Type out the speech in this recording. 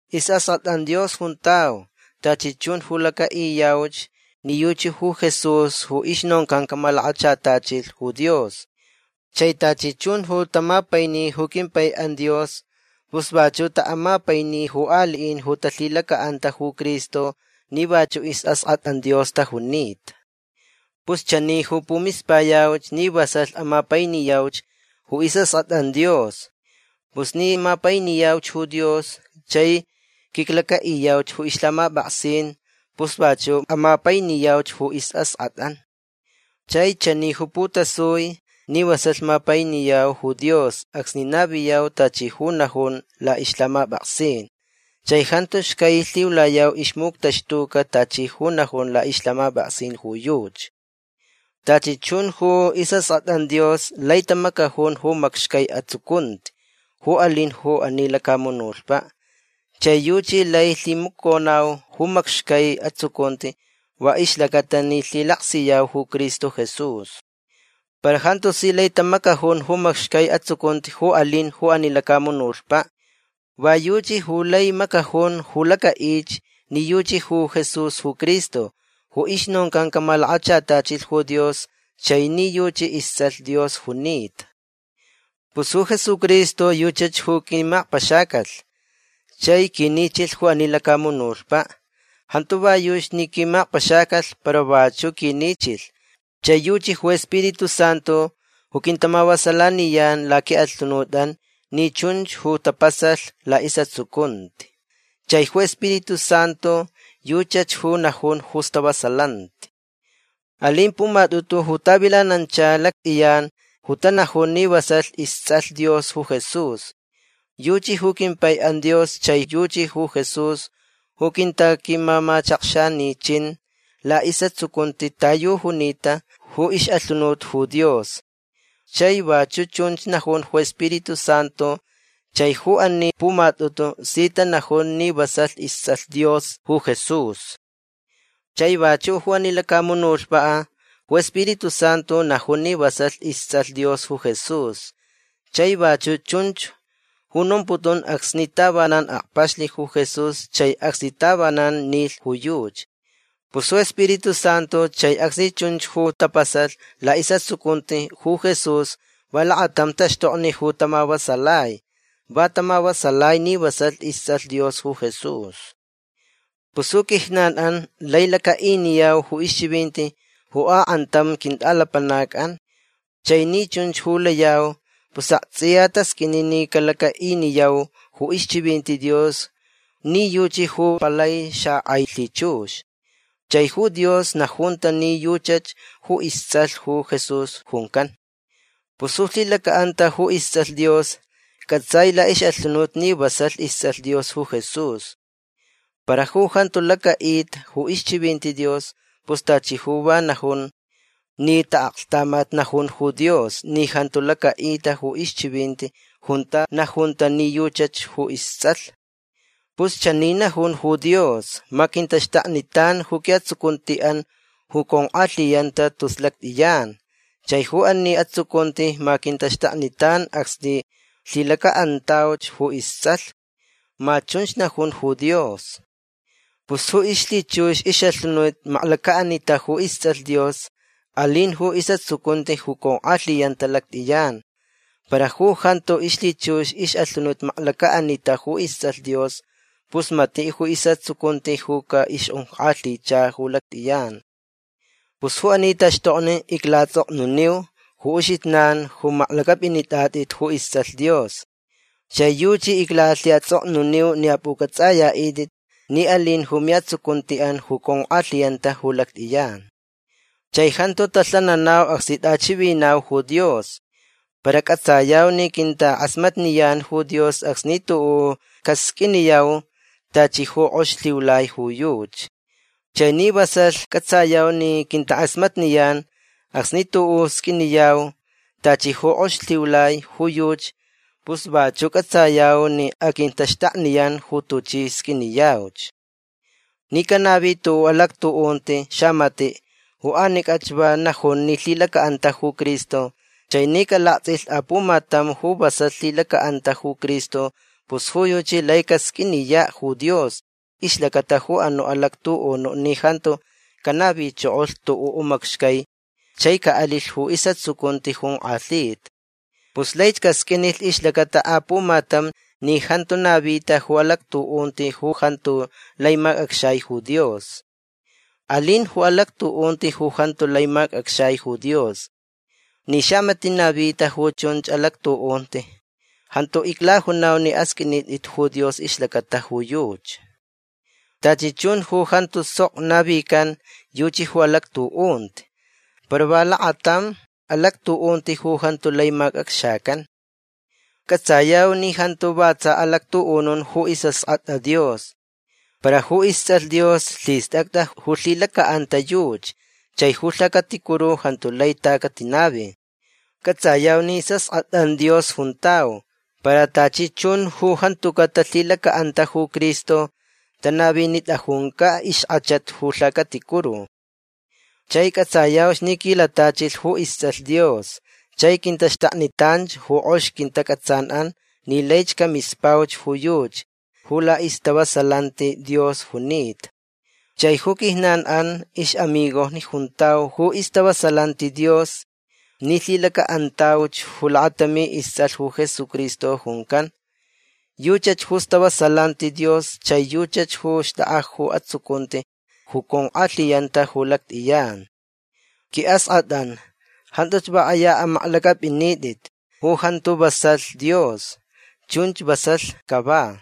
Isʼaskʼatʼan Dios juntau tachi chun ju lacaʼiyauch ni yuchi ju Jesús ju ixnoncan camalakachatachilh ju Dios. Chai tachi chun ju tamapaini ju quimpaiʼan Dios pus vachuʼ taʼamapaini ju aliʼin ju talhilacaʼanta ju Cristo ni vachuʼ isʼaskʼatʼan Dios tajunita. Pus chani ju pumispayau ni vasalh amapainiyauch ju isʼaskʼatʼan Dios. Pus ni mapainiyau ju Dios chai quiclacaʼiyau ju ixlhamapʼaksin pus vachuʼ amapainiyau ju isʼaskʼatʼan. Chai chani ju putasui ni vasalh mapainiyau ju Dios acsni naviyau tachi ju najun laʼixlhamapʼaksin. Chai jantu xcai lhiulayau ixmuctaxtuca tachi ju najun laʼixlhamapʼaksin ju yuchi. Tachi chun ju isʼaskʼatʼan Dios lai tamacajun ju macxcai atsucunti ju alin ju ani lacamunutpaʼ. Chai yuchi lai lhimaconau ju macxcai atsucunti va ixlacata ni lhilaksiyau ju Cristo Jesús. Para jantu si lai tamacajun ju macxcai atsucunti ju alin ju ani lacamunutpaʼ. Va yuchi ju lai macajun ju lacaʼich ni yuchi ju Jesús ju Cristo ju ixnoncan camalakachatachilh ju Dios chai ni yuchi istsʼalh Dios junita. Pus ju Jesucristo yuchach ju quimakpaxacalh chai quinichilh ju ani lacamunutpaʼ. Jantu va yuchi ni quimakpaxacalh para vachuʼ quinichilh. Chai yuchi ju Spiritu Santu ju quintamavasalaniyan laquiʼalhunutʼan ni chunch ju tapasalh laʼisʼatsucunti. Chai ju Spiritu Santu yuchach ju najun ju istavasalanti. Alin pumatʼutu ju tavilanancha lactʼiyan ju tanajun ni vasalh istsʼalh Dios ju Jesús. Yuchi ju quimpaiʼan Dios chai yuchi ju Jesús ju quintaquimamachakxanichin laʼisʼatsucunti ta yu junita ju ixʼalhunut ju Dios. Chai vachuʼ chunch najun ju Spiritu Santu. Chai ju ani pumatʼutu si tanajun ni vasalh istsʼalh Dios ju Jesús. Chai vachuʼ ju ani lacamunutpaʼ ju Spiritu Santu najun ni vasalh istsʼalh Dios ju Jesús. Chai vachuʼ chunch ju nomputun acsni tavanan akpaxlh ju Jesús chai acsni tavanan nilh ju yuchi. Pus ju Spiritu Santu chai acsni chunch ju tapasalh laʼisʼatsucunti ju Jesús va lakatam taxtokni ju tamavasalai. Va tamavasalai ni vasalh istsʼalh Dios ju Jesús. Pus ju quijnanʼan lai lacaʼiniyau ju ixchivinti ju akʼantam quintʼalapanacʼan. Chai ni chunch ju layau pus aktsʼiya tasqʼuini ni calacaʼiniyau ju ixchivinti Dios ni yuchi ju palai xakʼai lhichux. Chai ju Dios najunta ni yuchach ju istsʼalh ju Jesús juncan. Pus ju lhilacaʼanta ju istsʼalh Dios cʼatsai laʼixʼalhunut ni vasalh istsʼalh Dios ju Jesús. Para ju jantu lacaʼita ju ixchivinti Dios pus tachi ju va najun ni taʼaklhtamat najun ju Dios ni jantu lacaʼita ju ixchivinti junta najunta ni yuchach ju istsʼalh. Pus chani najun ju Dios: “Ma quintaxtaknitan ju quiʼatsucuntiʼan ju conkʼalhiyanta tus lactʼiyan. Chai ju ani atsucunti ma quintaxtaknitan acsni lhilacaʼantauch ju istsʼalh”. Ma chunch najun ju Dios. Pus ju ixlhichux ixʼalhunut maklacaʼanita ju istsʼalh Dios alin ju isʼatsucunti ju conkʼalhiyanta lactʼiyan. Para ju jantu ixlhichux ixʼalhunut maklacaʼanita ju istsʼalh Dios pus matiʼ ju isʼatsucunti ju caʼixjonkʼalhicha ju lactʼiyan. Pus ju ani taxtokni iclaʼatsʼoknuniu ju uxijnan ju maklacʼapʼinitʼatʼit ju istsʼalh Dios. Chai yuchi iclalhiʼatsʼoknuniu ni apʼucʼatsʼayaʼitʼit ni alin ju miʼatsucuntiʼan ju conkʼalhiyanta ju lactʼiyan. Chai jantu talhananau acsni tʼachivinau ju Dios. Para cʼatsayau ni quintakʼasmatniyan ju Dios acsni tuʼuʼ casqʼuiniyau tachi ju kʼoxich lhiulai ju yuchi. Chai ni vasalh cʼatsayau ni quintakʼasmatniyan acsni tuʼuʼ sqʼuiniyau tachi ju kʼoxich lhiulai ju yuchi pus vachuʼ cʼatsayau ni aquintaxtakniyan ju tuchi sqʼuiniyauch. Ni canavi tuʼuʼ alactuʼunti xamatiʼ ju anicʼach va najun ni lhilacaʼanta ju Cristo chai ni calaktsʼilh apumatam ju vasalh lhilacaʼanta ju Cristo pus ju yuchi lai casqʼuiniyaʼ ju Dios ixlacata ju anuʼ alactuʼunuʼ ni jantu canavichokolh tuʼuʼ macxcai chai caʼalilh ju isʼatsucunti jonkʼalhita. Pus laich casqʼuinilh ixlacata apumatam ni jantu navita ju alactuʼunti ju jantu lai macʼacxai ju Dios. Alin ju alactuʼunti ju jantu lai macʼacxai ju Dios. Ni xamatiʼ navita ju chunch alactuʼunti jantu iclajunau ni asqʼuinitʼit ju Dios ixlacata ju yuchi. Tachi chun ju jantu sok navican yuchi ju alactuʼunti. Para va lakatam alactuʼunti ju jantu lai macʼacxacan. Cʼatsayau ni jantu va tsa alactuʼunun ju isʼaskʼatʼa Dios. Para ju istsʼalh Dios lhistʼacʼa ju lhilacaʼanta yuchi chai ju lhacaticuru jantu lai ta catinavi. Cʼatsayau ni isʼaskʼatʼan Dios juntau. Para tachi chun ju jantucaʼ talhilacaʼanta ju Cristo tanavinitʼajuncaʼ ixkʼachat ju lhacaticuru. Chai cʼatsayau ni quilatachilh ju istsʼalh Dios chai quintaxtaknitan ju kʼox quintacʼatsanʼan ni laich camispauch ju yuchi ju laʼistavasalanti Dios junita. Chai ju quijnanʼan ixʼamigojni juntau ju istavasalanti Dios ni lhilacaʼantauch ju lakatami istsʼalh ju Jesucristo juncan. Yuchach ju istavasalanti Dios chai yuchi ju xtʼakʼa ju atsucunti ju conkʼalhiyanta ju lactʼiyan. Quiʼaskʼatʼan jantuch va kʼaya amaklacʼapʼinitʼit ju jantu vasalh Dios. Chunch vasalh cava.